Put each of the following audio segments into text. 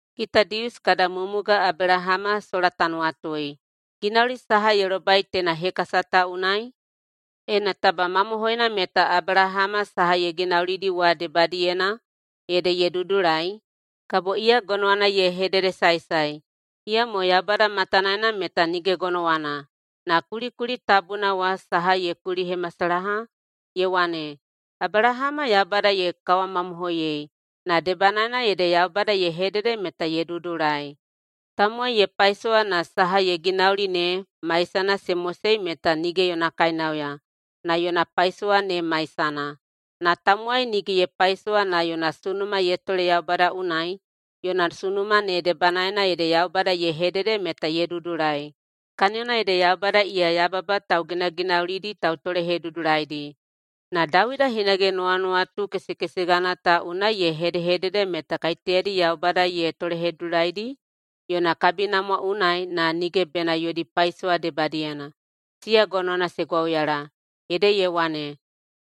Kita Dius kada mumuga Abelahama sola ta nuwatui, ginauli saha ye lobai teina hekasa ta unai? Ena taba mamohoina meta Abelahama saha ye ginaulidi wa debadiyena ede ye dudulai, kabo iya gonowana ye hededesaesae. Iyamo Yaubada matanaena meta nige gonowana. Na kulikuli tabuna wa saha ye kulihemasalaha? Ye wane, “Abelahama Yaubada ye kawamamohoiyei, na debanaena ede Yaubada ye hedede meta ye dudulai.” Tamowai ye paisowa na saha ye ginauli ne maisana se mosei meta nige yona kainauya, na yona paisowa ne maisana. Na tamowai nige ye paisowa na yona sunuma ye tole Yaubada unai, yona sunuma ne debanaena ede Yaubada ye hedede meta ye dudulai. Kaniyona ede Yaubada iya yababa tauginaginaulidi tautolehedudulaidi. Na Dawida hinage nuwanuwatu kesekesegana ta unai ye hedehedede meta kaiteyadi Yaubada ye tolehedudulaidi [yona kabinamwa unai na] nige bena yodi paisowa debadiyena, siya gonowana se gwauyala. Ede ye wane,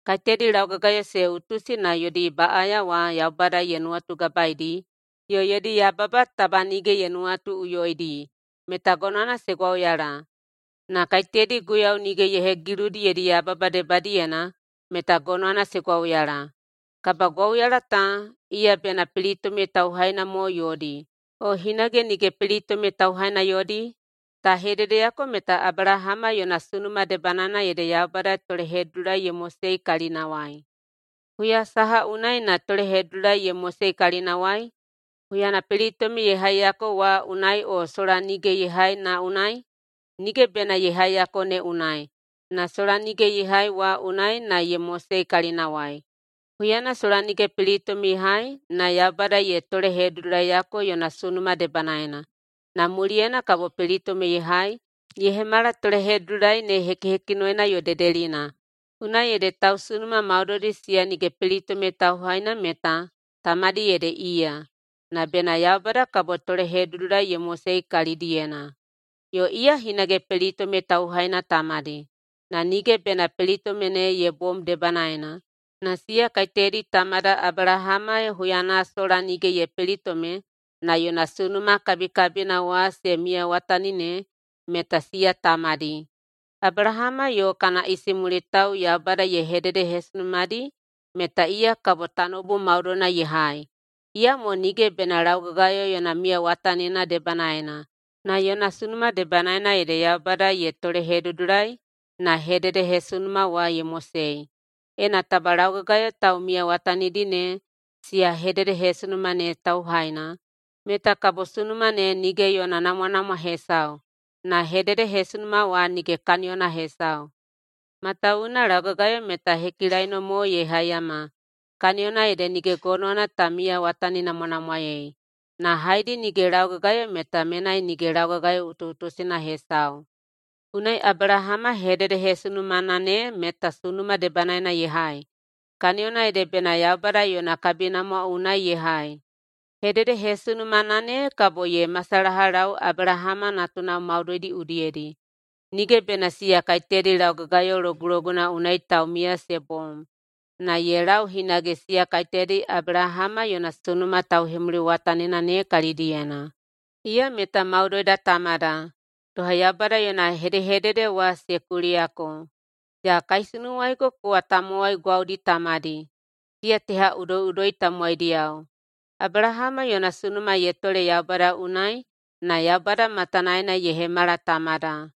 “Kaiteyadi laugagayo se utusi na yodi baꞌaya wa Yaubada ye nuwatugabaeidi, yo yodi yababa taba nige ye nuwatuꞌuyoidi, meta gonowana se gwauyala. Na kaiteyadi Guiyau nige ye hegiludi yodi yababa debadiyena, meta gonowana se gwauyala.” Kabagwauyala ta, iya bena pelitome tauhaina mo yodi, o hinage nige pelitome tauhaina yodi? Ta hededeyako meta Abelahama yona sunuma debanaena ede Yaubada tolehedudulai ye mosei kalinawai. Huya saha unai na tolehedudulai ye mosei kalinawai? Huyana pelitome ye haiyako wa unai o sola nige ye hai na unai? Nige bena ye haiyako ne unai, na sola nige ye hai wa unai na ye mosei kalinawai. Huyana sola nige pelitome ye hai na Yaubada ye tolehedudulaiyako yona sunuma debanaena, na muliyena kabo pelitome ye hai ye hemala tolehedudulai ne hekihekinoina yo dedelina. Unai ede tausunuma maudoidi siya nige pelitome tauhaina meta tamadi ede iya, na bena Yaubada kabo tolehedudulai ye mosei kalidiyena. Yo iya hinage pelitome tauhaina tamadi, na nige bena pelitome ne ye bom debanaena, na siya kaiteyadi tamada Abelahama huyana sola nige ye pelitome na yona sunuma kabikabina wa se miyawatani ne, meta siya tamadi. Abelahama yo kana isimulitao Yaubada ye hededehesunumadi meta iya kabo tanoubu maudoina ye hai, iyamo nige bena laugagayo yona miyawatanina debanaena. Na yona sunuma debanaena ede Yaubada ye tolehedudulai na hededehesunuma wa ye mosei. Ena taba laugagayo taumiyawatanidi ne siya hededehesunuma ne tauhaina, meta kabo sunuma ne nige yona namwanamwa hesau, na hededehesunuma wa nige kaniyona hesau. Matawuwuna laugagayo meta hekilaino mo ye haiyama, [kaniyona ede nige gonowana ta miyawataninamwanamwaei]. Na haedi nige laugagayo meta menai nige laugagayo utuꞌutusina hesau. Unai Abelahama hededehesunumana ne meta sunuma debanaena ye hai, kaniyona ede bena Yaubada yona kabinamwa unai ye hai. Hededehesunumana ne kabo ye masalahalau Abelahama natunao maudoidi udiyedi, nige bena siya kaiteyadi laugagayo loguloguna unai taumiya se bom, na ye lau hinage siya kaiteyadi Abelahama yona sunuma tauhemuliwatanina ne kalidiyena. Iya meta maudoida tamada. Doha Yaubada yona hedehedede wa se kuliyako, “Ya kaisunuwaigo kowa tamowai gwaudi tamadi, siya teha udoiꞌudoi tamowaidiyao.”. Abelahama yona sunuma ye tole Yaubada unai na Yaubada matanaena ye hemala tamada.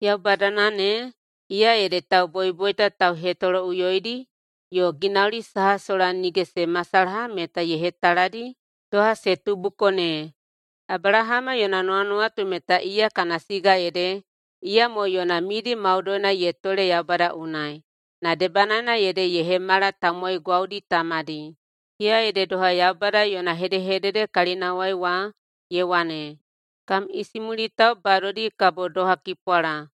Yaubadana ne, iya ede tauboiboita tauhetoloꞌuyoidi yo ginauli saha sola nige se masalaha meta ye hetaladi doha se tubuko ne. Abelahama yona nuwanuwatu meta iya kana siga ede, iyamo yona midi maudoina ye tole Yaubada unai, na debanaena ede ye hemala tamowai gwaudi tamadi. Iya ede doha Yaubada yona hedehedede kalinawai wa, ye wane, “Kam isimulitao badodi kabo doha kipwala.”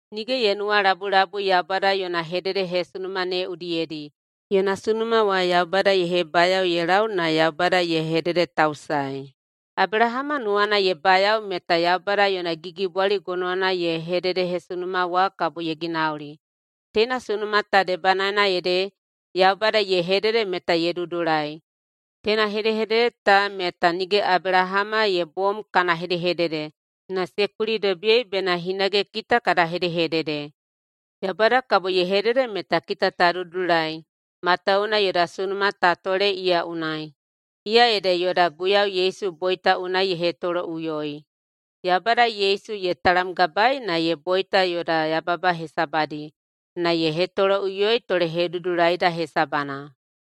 Nige ye nuwalabulabui Yaubada yona hededehesunuma ne udiyedi. Yona sunuma wa Yaubada ye hebayao ye lau na Yaubada ye hededetausaei. Abelahama nuwana ye bayao meta Yaubada yona gigibwali gonowana yona hededehesunuma wa kabo ye ginauli. Teina sunuma ta debanaena ede “Yaubada ye hedede meta ye dudulai.” Teina hedehedede ta meta nige Abelahama ye bom kana hedehedede, na se kulidobiyei bena hinage kita kada hedehedede. Yaubada kabo ye hedede meta kita ta dudulai matawuwuna yoda sunuma ta tole iya unai, iya ede yoda Guiyau Yesu boita unai ye hetoloꞌuyoi. Yaubada Yesu ye talamgabaei na ye boita yoda yababa hesabadi, na ye hetoloꞌuyoi tolehedudulaida hesabana.